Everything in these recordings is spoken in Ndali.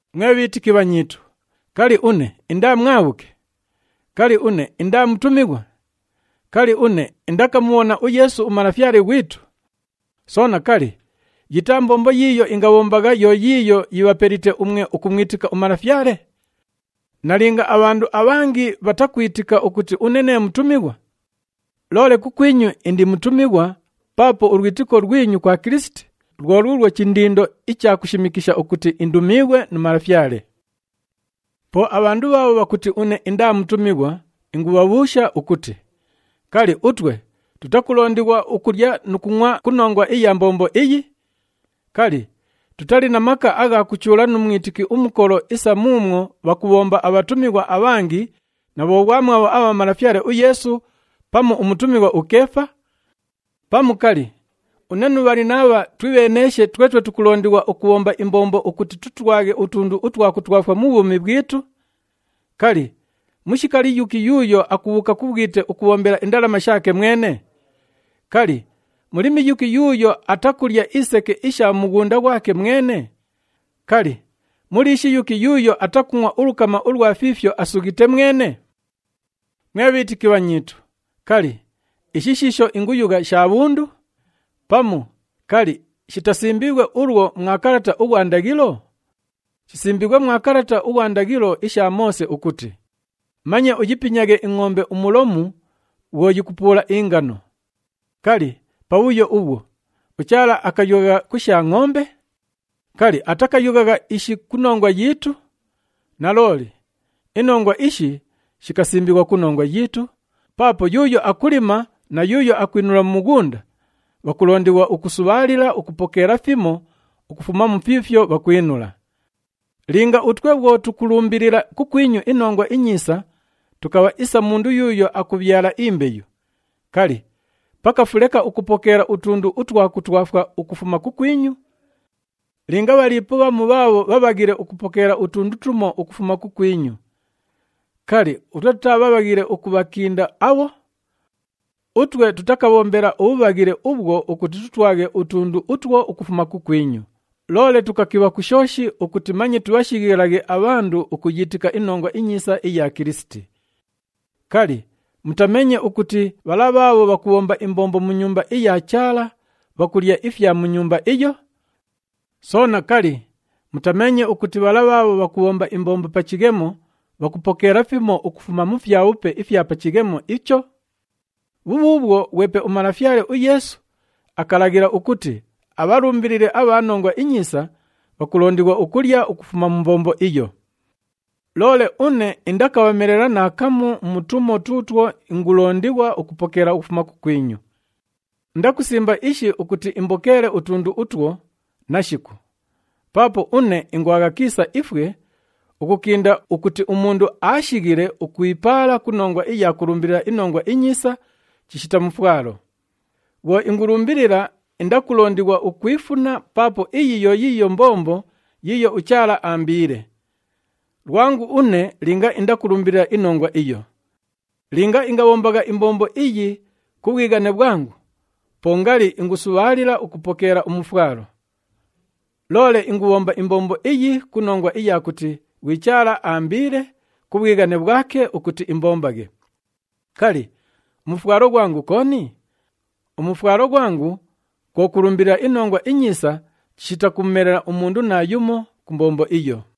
Mwe bhiitiki bhanyiitu, kali, une indaa mwabhuke? Kali, une indaa mutumighwa? Kali, une indakamubhona uYeesu uMalafyale ghwitu? Soona, kali, yitaa mbombo yiiyo ingabhombagha yo yiiyo yibhapelite umwe ukumwitika uMalafyale? Nalinga abhandu abhangi bhatakwitika ukuti une nee mutumighwa, loole kukwinyu indi mutumighwa paapo ulwitiko lwinyu kwa Kilisiti lwo luulwo chindindo icha kushimikisha ukuti indumiighwe nu Malafyale. Po abhandu bhaabho bhakuti une indaa mutumighwa ingubhabhuusha ukuti, kali, utwe tutakulondighwa ukulya nu kungʼwa ku nongwa iya mbombo iyi? Kali, tutali na maka agha kuchuula nu mwitiki umukolo isa muumwo bhakubhomba abhatumighwa abhangi na bhoghwamwabho abha Malafyale uYeesu pamu umutumighwa uKeefa? Pamu, kali, une nu Bhalinabha twibheeneeshe twetwe tukulondighwa ukubhomba imbombo ukuti tutwaghe utundu utwa kutwafwa mu bhwumi bhwitu? Kali, mushikali yuki yuuyo akubhuuka ku bhwite ukubhombela indalama shaake mwene? Kali, mulimi yuki yuuyo atakulya iseke isha mu mughunda ghwake mwene? Kali, muliishi yuki yuuyo atakungʼwa ulukama ulwa fiifyo asughite mwene? Mwe bhiitiki bhanyiitu, kali, ishi shiisho inguyugha sha bhundu? Pamu, kali, shitasimbiighwe ulwo mwa kalata ughwa ndaghilo? Shisimbiighwe mwa kalata ughwa ndaghilo isha Moose ukuti, “Manye uyipinyaghe ingʼombe umulomu bhwo yikupuula ingano.” Kali, pabhuyo ubhwo, uChaala akayughagha ku sha ngʼombe? Kali, atakayughagha ishi ku nongwa yiitu? Nalooli, inongwa ishi shikasimbighwa ku nongwa yiitu, paapo yuuyo akulima na yuuyo akwinula mu mughunda, bhakulondighwa ukusubhaalila ukupokeela fimo ukufuma mu fiifyo bhakwinula. Linga utwe bhwo tukulumbilila kukwinyu iNongwa iNyiisa tukabha isa umundu yuuyo akubhyala imbeyu, kali, pakafu leka ukupokeela utundu utwa kutwafwa ukufuma kukwinyu? Linga bhaliipo bhamu bhaabho bhabhaghile ukupokeela utundu tumo ukufuma kukwinyu, kali, utwe tutaa bhabhaghile ukubhakinda abho? Utwe tutakabhombela ubhubhaghile ubhwo ukuti tutwaghe utundu utwo ukufuma kukwinyu, loole tukakibha ku shooshi ukuti manye tubhashighilaghe abhandu ukuyiitika iNongwa iNyiisa iya Kilisiti. Kali, mutameenye ukuti bhala bhaabho bhakubhomba imbombo mu Nyumba iya Chaala bhakulya ifya mu nyumba iyo? Soona, kali, mutameenye ukuti bhala bhaabho bhakubhomba imbombo pa chighemo bhakupokeela fimo ukufuma mu fyabhupe ifya pa chighemo icho? Bhubhuubhwo, ghwepe uMalafyale uYeesu akalaghila ukuti abhalumbilili abha Nongwa iNyiisa, bhakulondighwa ukulya ukufuma mu mbombo iyo. Loole une indakabhamelela naakamu mu tumo tuutwo ingulondighwa ukupokeela ukufuma kukwinyu. Indakusimba ishi ukuti imbokeele utundu utwo, nashiku! Paapo une ingwagha kiisa ifwe, ukukinda ukuti umundu aashighile ukwipaala ku nongwa iya kulumbilila iNongwa iNyiisa chishita mufwalo. Bhwo ingulumbilila, indakulondighwa ukwifuna paapo iyi yo yiiyo mbombo yiiyo uChaala aambiile. Lwangu une linga indakulumbilila inongwa iyo! Linga ingabhombagha imbombo iyi ku bhwighane bhwangu, po ngali ingusubhaalila ukupokeela umufwalo. Loole ingubhomba imbombo iyi ku nongwa iya kuti ghwi Chaala aambiile ku bhwighane bhwake ukuti imbombaghe. Kali, umufwalo ghwangu kooni? Umufwalo ghwangu kwo kulumbilila iNongwa iNyiisa chishita kumumelela umundu naayumo ku mbombo iyo.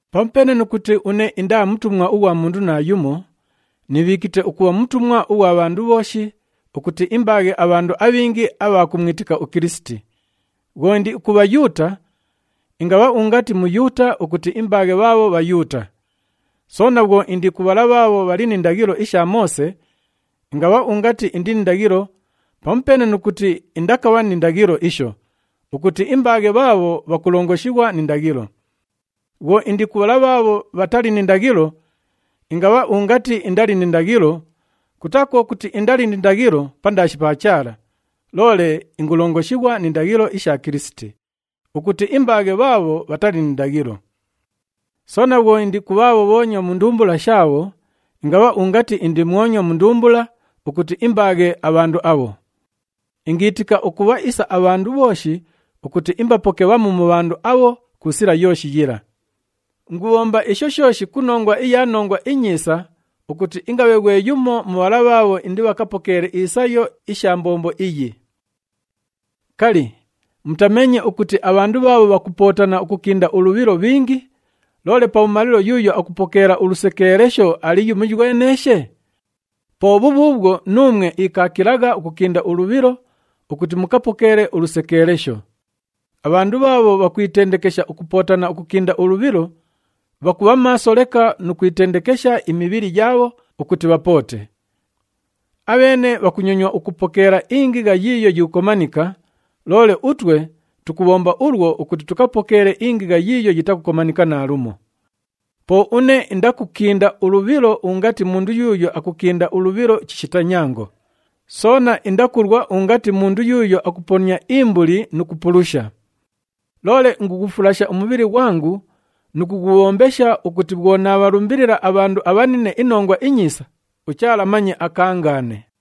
Pamupeene nu kuti une indaa mutumwa ughwa mundu naayumo, niibhiikite ukubha mutumwa ughwa bhandu bhooshi ukuti imbaaghe abhandu abhingi abha kumwitika uKilisiti. Bhwo indi ku Bhayuuta, ingabha ungati Muyuuta ukuti imbaaghe bhaabho Bhayuuta. Soona bhwo indi ku bhala bhaabho bhali ni ndaghilo isha Moose, ingabha ungati indi ni ndaghilo (pamupeene nu kuti indakabha ni ndaghilo isho) ukuti imbaaghe bhaabho bhakulongoshighwa ni ndaghilo. Bhwo indi ku bhala bhaabho bhatali ni ndaghilo, ingabha ungati indali ni ndaghilo (kutaa kwo kuti indali ni ndaghilo pandaashi pa Chaala, loole ingulongoshighwa ni ndaghilo isha Kilisiti) ukuti imbaaghe bhaabho bhatali ni ndaghilo. Soona bhwo indi ku bhaabho bhoonywa mu ndumbula shaabho, ingabha ungati indi mwonywa mu ndumbula ukuti imbaaghe abhandu abho. Ingiitika ukubha isa abhandu bhooshi ukuti imbapoke bhamu mu bhandu abho ku sila yooshi yila. Ingubhomba isho shooshi ku nongwa iya Nongwa iNyiisa ukuti ingabhe ghwe yumo mu bhala bhaabho indibhakapokeele isayo isha mbombo iyi. Kali, mutameenye ukuti abhandu bhaabho bhakupootana ukukinda ulubhilo bhingi, loole pabhumalilo yuuyo akupokeela ulusekeelesho ali yumoyweneeshe? Po bhubhuubhwo nuumwe ikaakilagha ukukinda ulubhilo ukuti mukapokeele ulusekeelesho. Abhandu bhaabho bhakwitendekesha ukupootana ukukinda ulubhilo, bhakubha maaso leka nu kwitendekesha imibhili yaabho ukuti bhapoote. Abheene bhakunyonywa ukupokeela ingigha yiiyo yikukomanika, loole utwe tukubhomba ulwo ukuti tupokeele ingigha yiiyo yitakukomanika naalumo. Po une indakukinda ulubhilo ungati mundu yuuyo akukinda ulubhilo chishita nyango, soona indakulwa ungati mundu yuuyo akuponia imbuli nu kupulusha. Loole ingughufulasha umubhili ghwangu nu kughubhombesha ukuti bhwo naabhalumbilila abhandu abhanine iNongwa iNyiisa, uChaala manye akaangaane.